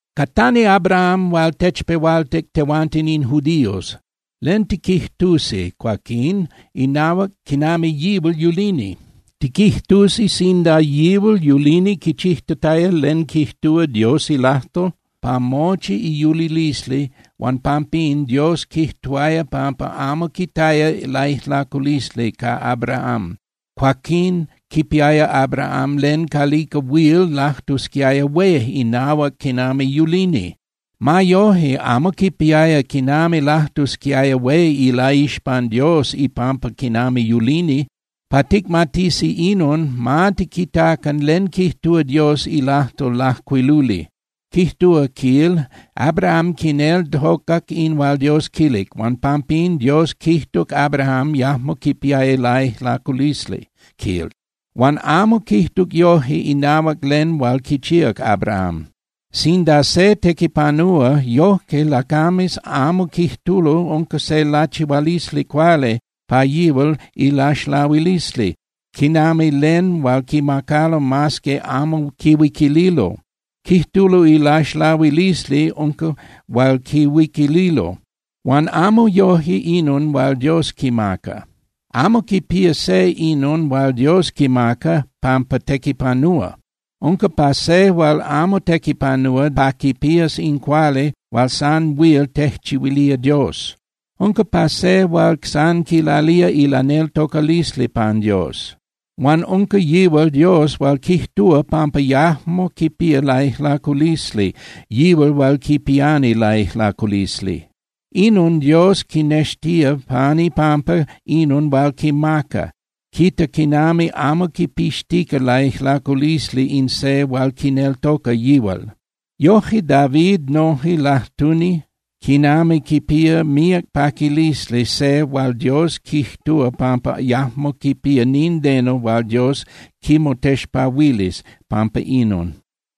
Catani Abraham hual techpehualtic tehuanten in judíos. ¿Len tiquijtusi, cuaquín, inahuac quinami yihual yulini? Tiquijtusi sinda yihual yulini quichijtataya len quijtúa Dios ilajtol pa mochi iyulilisli huan pampín Dios quijtuaya pampa amo quitaya laijlaculisli ca Abraham, cuaquín quipiaya Abraham len calica huil lajtusquiaya hué inahuac quinami yulini. Ma yoje, amo quipiaya quinami lajtusquiaya hué ilaixpan Dios ipampa quinami yulini. Pa ticmatisi inon, ma tiquitacan len quijtúa Dios ilajtol lajcuiluli. Quijtúa, quil: “Abraham quineltocac in hual Dios quilic, huan pampín Dios quijtuc Abraham yajmo quipiaya laijlaculisli”, quil. Huan amo quijtuc yoje inahuac len hual quichíac Abraham. Sinda se tequipanúa, yoje lacames amo quijtulo unca se lachihualisli cuali pa yihual ilaxlahuilisli, quinami len hual quimacalo mas que amo quihuiquililo. Quijtulo ilaxlahuilisli unca hual quihuiquililo. Huan amo yoje inon hual Dios quimaca. Amo quipía se inon hual Dios quimaca pampa tequipanúa. Unca pa se hual amo tequipanúa pa quipías in cuali hual san huil tejchihuilía Dios, unca pa se hual san quilalía ilaneltocalisli pan Dios. Huan unca yihual Dios hual quijtúa pampa yajmo quipía laijlaculisli yihual hual quipiani laijlaculisli. Inon Dios quinextía pan ipampa inon hual quimaca, quita quinami amo quipixtica laijlaculisli in se hual quineltoca yihual. Yoje David noje lajtuni quinami quipía míac paquilisli se hual Dios quijtúa pampa yajmo quipía nindeno hual Dios quimotexpahuilis pampa inon.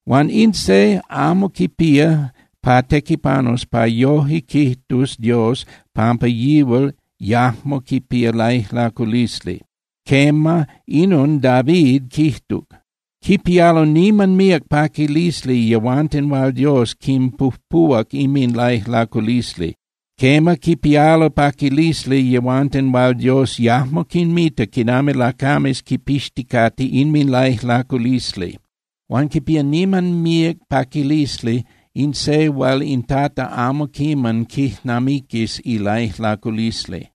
Huan in se amo quipía pa tequipanus pa yoje quijtus Dios pampa yihual yajmo quipía laijlaculisli. Quema, inon David quijtuc: Quipialo niman míac paquilisli yehuanten hual Dios quinpujpuhuac inminlaijlaculisli. Quema, quipialo paquilisli yehuanten hual Dios yajmo quinmita quinami lacames quipixticate inminlaijlaculisli. Huan quipía niman míac paquilisli in se hual in Tata amo quiman quijnamiquis ilaijlaculisli.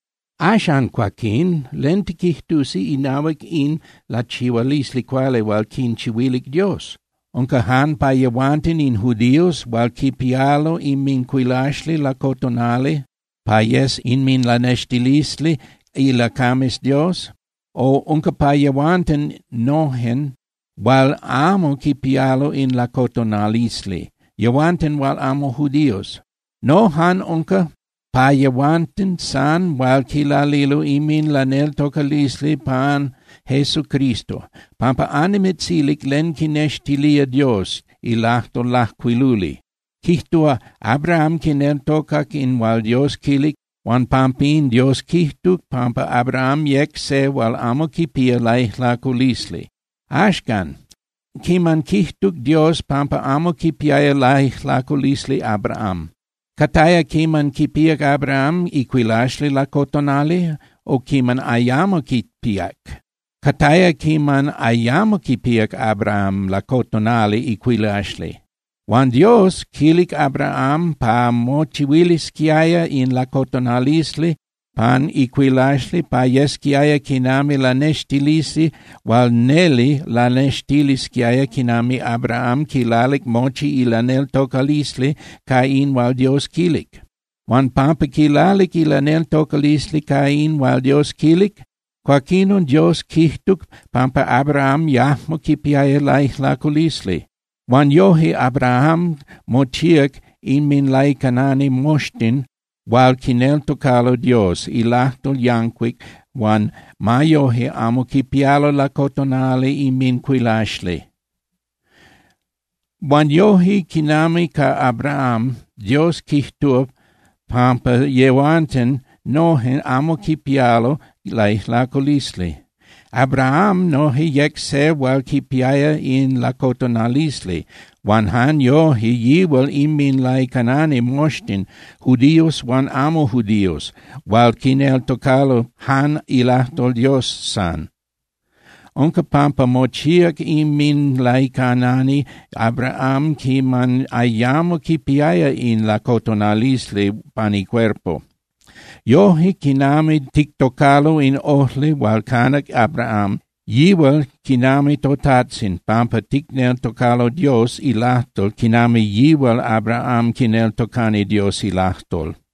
Axan, cuaquín, ¿len tiquijtusi inahuac in lachihualisli cuali hual quinchihuilic Dios? ¿Unca jan pa yehuanten in judíos hual quipialo inmincuilaxli lacotonali pa yes inminlanextilisli ilacames Dios? O, ¿unca pa yehuanten nojen hual amo quipialo in lacotonalisli, yehuanten hual amo judíos? No, jan unca pa yehuanten san hual quilalilo inminlaneltocalisli pan Jesucristo, pampa annimitzilic len quinextilía Dios ilajtol lajcuiluli. Quijtúa: “Abraham quineltocac in hual Dios quilic, huan pampín Dios quijtuc pampa Abraham yec se hual amo quipía laijlaculisli.” Axcan, ¿quiman quijtuc Dios pampa amo quipiaya laijlaculisli Abraham? ¿Cataya quiman quipíac Abraham icuilaxli lacotonali, o quiman ayamo quipíac? Cataya quiman ayamo quipíac Abraham lacotonali icuilaxli. Huan Dios quilic Abraham pa mochihuilisquiaya in lacotonalisli pan icuilaxli pa yesquiaya quinami lanextilisli hual neli lanextilisquiaya quinami Abraham quilalic mochi ilaneltocalisli ca in hual Dios quilic. Huan pampa quilalic ilaneltocalisli ca in hual Dios quilic, cuaquinon Dios quijtuc pampa Abraham yajmo quipiaya laijlaculisli. Huan yoje Abraham mochíac inminlaicanani moxtin hual quineltocalo Dios ilajtol yancuic huan ma yoje amo quipialo lacotonali inmincuilaxli. Huan yoje quinami ca Abraham, Dios quijtúa pampa yehuanten nojen amo quipialo laijlaculisli. Abraham noje yec se hual quipiaya in lacotonalisli, huan jan yoje yihual inminlaicanani moxtin, judíos huan amo judíos, hual quineltocalo jan ilajtol Dios san. Unca pampa mochíac inminlaicanani Abraham quiman ayamo quipiaya in lacotonalisli pan icuerpo. Yoje, quinami tictocalo in ojli hual canac Abraham, yihual quinami totajtzin pampa ticneltocalo Dios ilajtol quinami yihual Abraham quineltocani Dios ilajtol.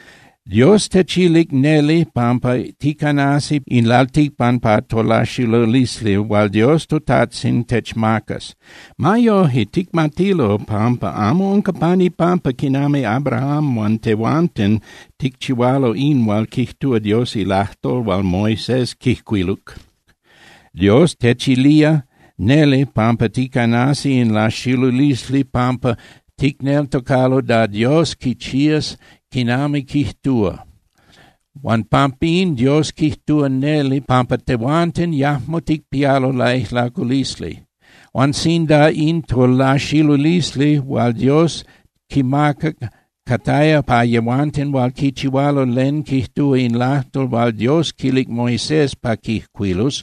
Dios techilic neli pampa ticanasi in lalticpan pa tolaxilulisli hual toTajtzin Dios techmacas. Ma yoje, ticmatilo pampa amo unca pan ipampa quinami Abraham huan tehuanten ticchihualo in hual quijtúa Dios ilajtol hual Moisés quijcuiluc. Dios techilía neli pampa ticanasi in laxilulisli pampa ticneltocalo da Dios quichías quinami quijtúa. Huan pampín Dios quijtúa neli pampa tehuanten yajmo ticpialo laijlaculisli. Huan sinda in tolaxilulisli hual Dios quimaca cataya pa yehuanten hual quichihualo len quijtúa in lajtol hual Dios quilic Moisés pa quijcuilus,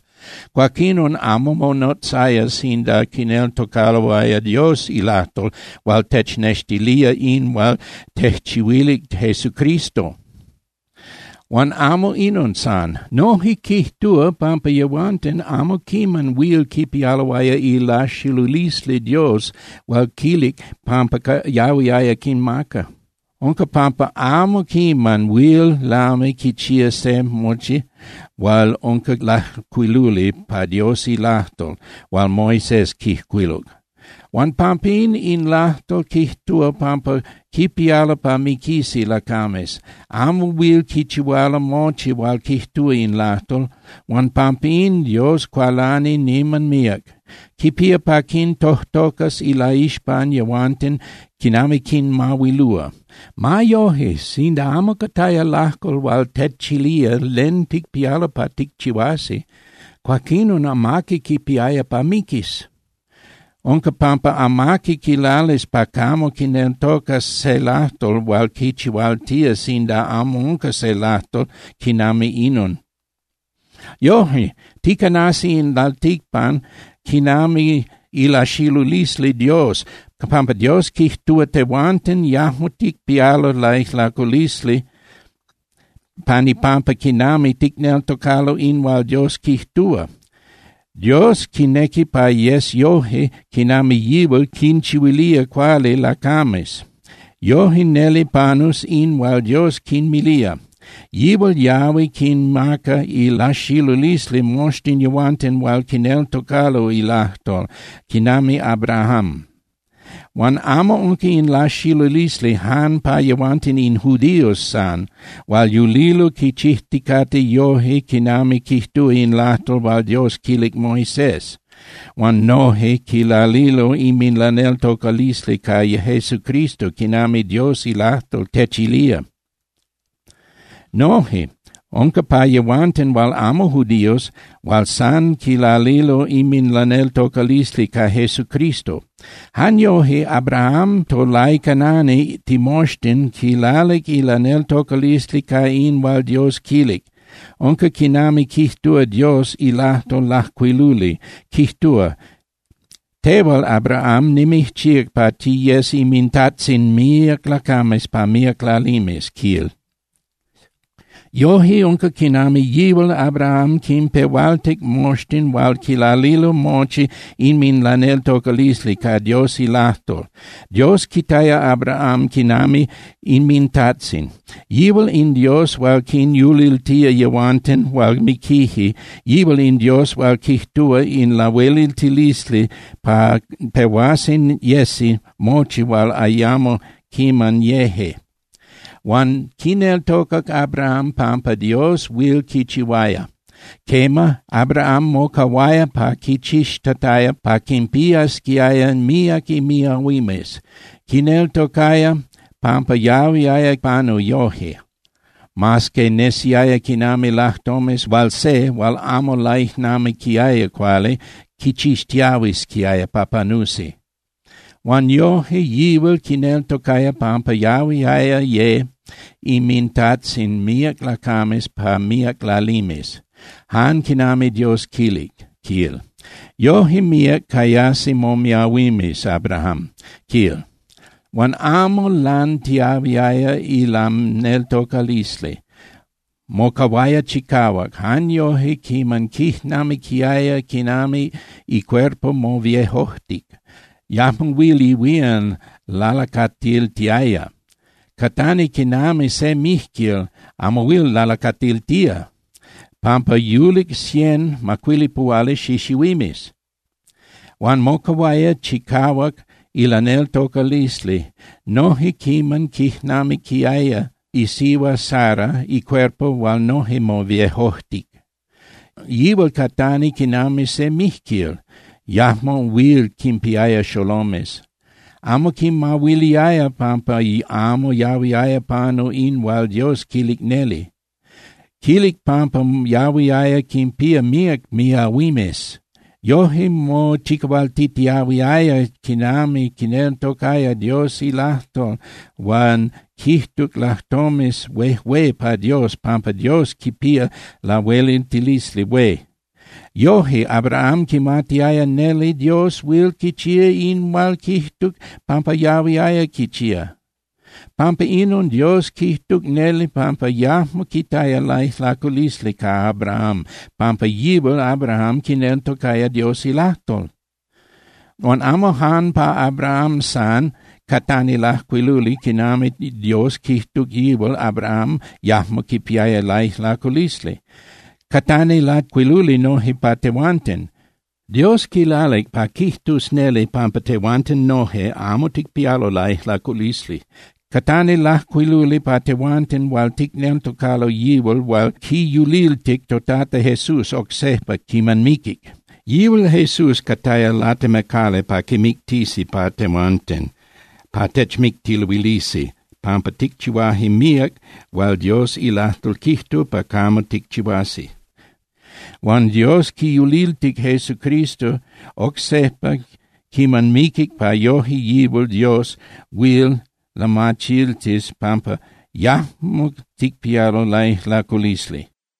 cuaquinon amo monotzaya sinda quineltocaloaya Dios ilajtol hual technextilía in hual tejchihuilic Jesucristo. Huan amo inon san. Noje quijtúa pampa yehuanten amo quiman huil quipialoaya ilaxilulisli Dios hual quilic pampa yahuiaya quinmaca. Unca pampa amo quiman huil lami quichía se mochi hual unca lajcuiluli pa Dios ilajtol hual Moisés quijcuiluc. Huan pampín, in lajtol quijtúa pampa quipialo pa miquisi lacames. Amo huil quichihualo mochi hual quijtúa in lajtol, huan pampín Dios cualani niman míac. Quipía pa quintojtocas ilaixpan yehuanten quinami quinmahuilúa. Ma yoje, sinda amo cataya lajtol hual techilía len ticpialo pa ticchihuasi, cuaquinon amaqui quipiaya pa miquis. Unca pampa amaqui quilalis pa camo quineltocas se lajtol hual quichihualtía sinda amo unca se lajtol quinami inon. Yoje, ticanasi in lalticpan quinami ilaxilulisli Dios pampa Dios quijtúa tehuanten yajmo ticpialo laijlaculisli pan ipampa quinami ticneltocalo in hual Dios quijtúa. Dios quinequi pa yes yoje quinami yihual quinchihuilía cuali lacames. Yoje neli panus in hual Dios quinmilía. Yihual yahui quinmaca ilaxilulisli moxtin yehuanten hual quineltocalo ilajtol quinami Abraham. Huan amo unca in laxilulisli jan pa yehuanten in judíos san hual yulilo quichijticate yoje quinami quijtúa in lajtol hual Dios quilic Moisés, huan noje quilalilo inminlaneltocalisli ca Jesucristo quinami Dios ilajtol techilía. Noje unca pa yehuanten hual amo judíos hual san quilalilo inminlaneltocalisli ca Jesucristo. Jan yoje Abraham tolaicanani timoxtin quilalic ilaneltocalisli ca in hual Dios quilic. Unca quinami quijtúa Dios ilajtol lajcuiluli, quijtúa: “Tehual Abraham nimijchíac pa tiyes inmintajtzin míac lacames pa míac lalimes”, quil. Yoje unca quinami yihual Abraham quinpehualtic moxtin hual quilalilo mochi inminlaneltocalisli ca Dios ilajtol. Dios quitaya Abraham quinami inmintajtzin. Yihual in Dios hual quinyuliltía yehuanten hual miquije, yihual in Dios hual quijtúa ca lahueliltilisli pa pehuasi yesi mochi hual ayamo quiman yeje. Huan quineltocac Abraham pampa Dios huil quichihuaya. Quema, Abraham mocahuaya quichixtataya pa quinpiasquiaya míac imiahuimes. Quineltocaya pampa yahuiaya panu yoje, mas que nesiaya quinami lajtomes hual se hual amo laijnamiquiaya cuali quichixtiahuisquiaya pa panusi. Huan yoje yihual quineltocaya pampa yahuiaya ye inmintajtzin míac lacames pa míac lalimes, jan quinami Dios quilic, quil: “Yoje míac cayasi momiahuimes, Abraham”, quil. Huan amo lantiyahuiaya ilaneltocalisli. Mocahuaya chicahuac jan yoje quiman quijnamiquiaya quinami icuerpo moviejojtic, yajmo huil ihuían lalacatiltiaya. Catani quinami se mijquil amo huil lalacatiltía, pampa yulic cien (macuilipuhuali) xixihuimes. Huan mocahuaya chicahuac ilaneltocalisli noje quiman quijnamiquiaya isihua Sara icuerpo hual noje moviejojtic. Yihual catani quinami se mijquil, yajmo huil quinpiaya xolomes. Amo quimahuiliaya pampa amo yahuiaya panu in hual Dios quilic neli. Quilic pampa yahuiaya quinpía míac miahuimes. Yoje mochicahualtitiahuiaya quinami quineltocaya Dios ilajtol huan quijtuc lajtomes huejué pa Dios pampa Dios quipía lahueliltilisli hué. Yoje Abraham quimatiaya neli Dios huil quichía in hual quijtuc pampa yahuiaya quichía. Pampa inon, Dios quijtuc neli pampa yajmo quitaya laijlaculisli ca Abraham pampa yihual Abraham quineltocaya Dios ilajtol. Huan amo jan pa Abraham san catani lajcuiluli quinami Dios quijtuc yihual Abraham yajmo quipiaya laijlaculisli. Catani lajcuiluli noje pa tehuanten. Dios quilalic pa quijtus neli pampa tehuanten noje amo ticpialo laijlaculisli. Catani lajcuiluli pa tehuanten hual ticneltocalo yihual hual quiyuliltic toTata Jesús oc sejpa quiman miquic. Yihual Jesús cataya latemacali pa quimictisi pa tehuanten (pa techmictiluilisi) pampa ticchihuaje míac hual Dios ilajtol quijtúa pa camo ticchihuasi. Huan Dios quiyuliltic Jesucristo oc sejpa quiman miquic pa yoje yihual Dios huil lamachiltis pampa yajmo ticpialo laijlaculisli.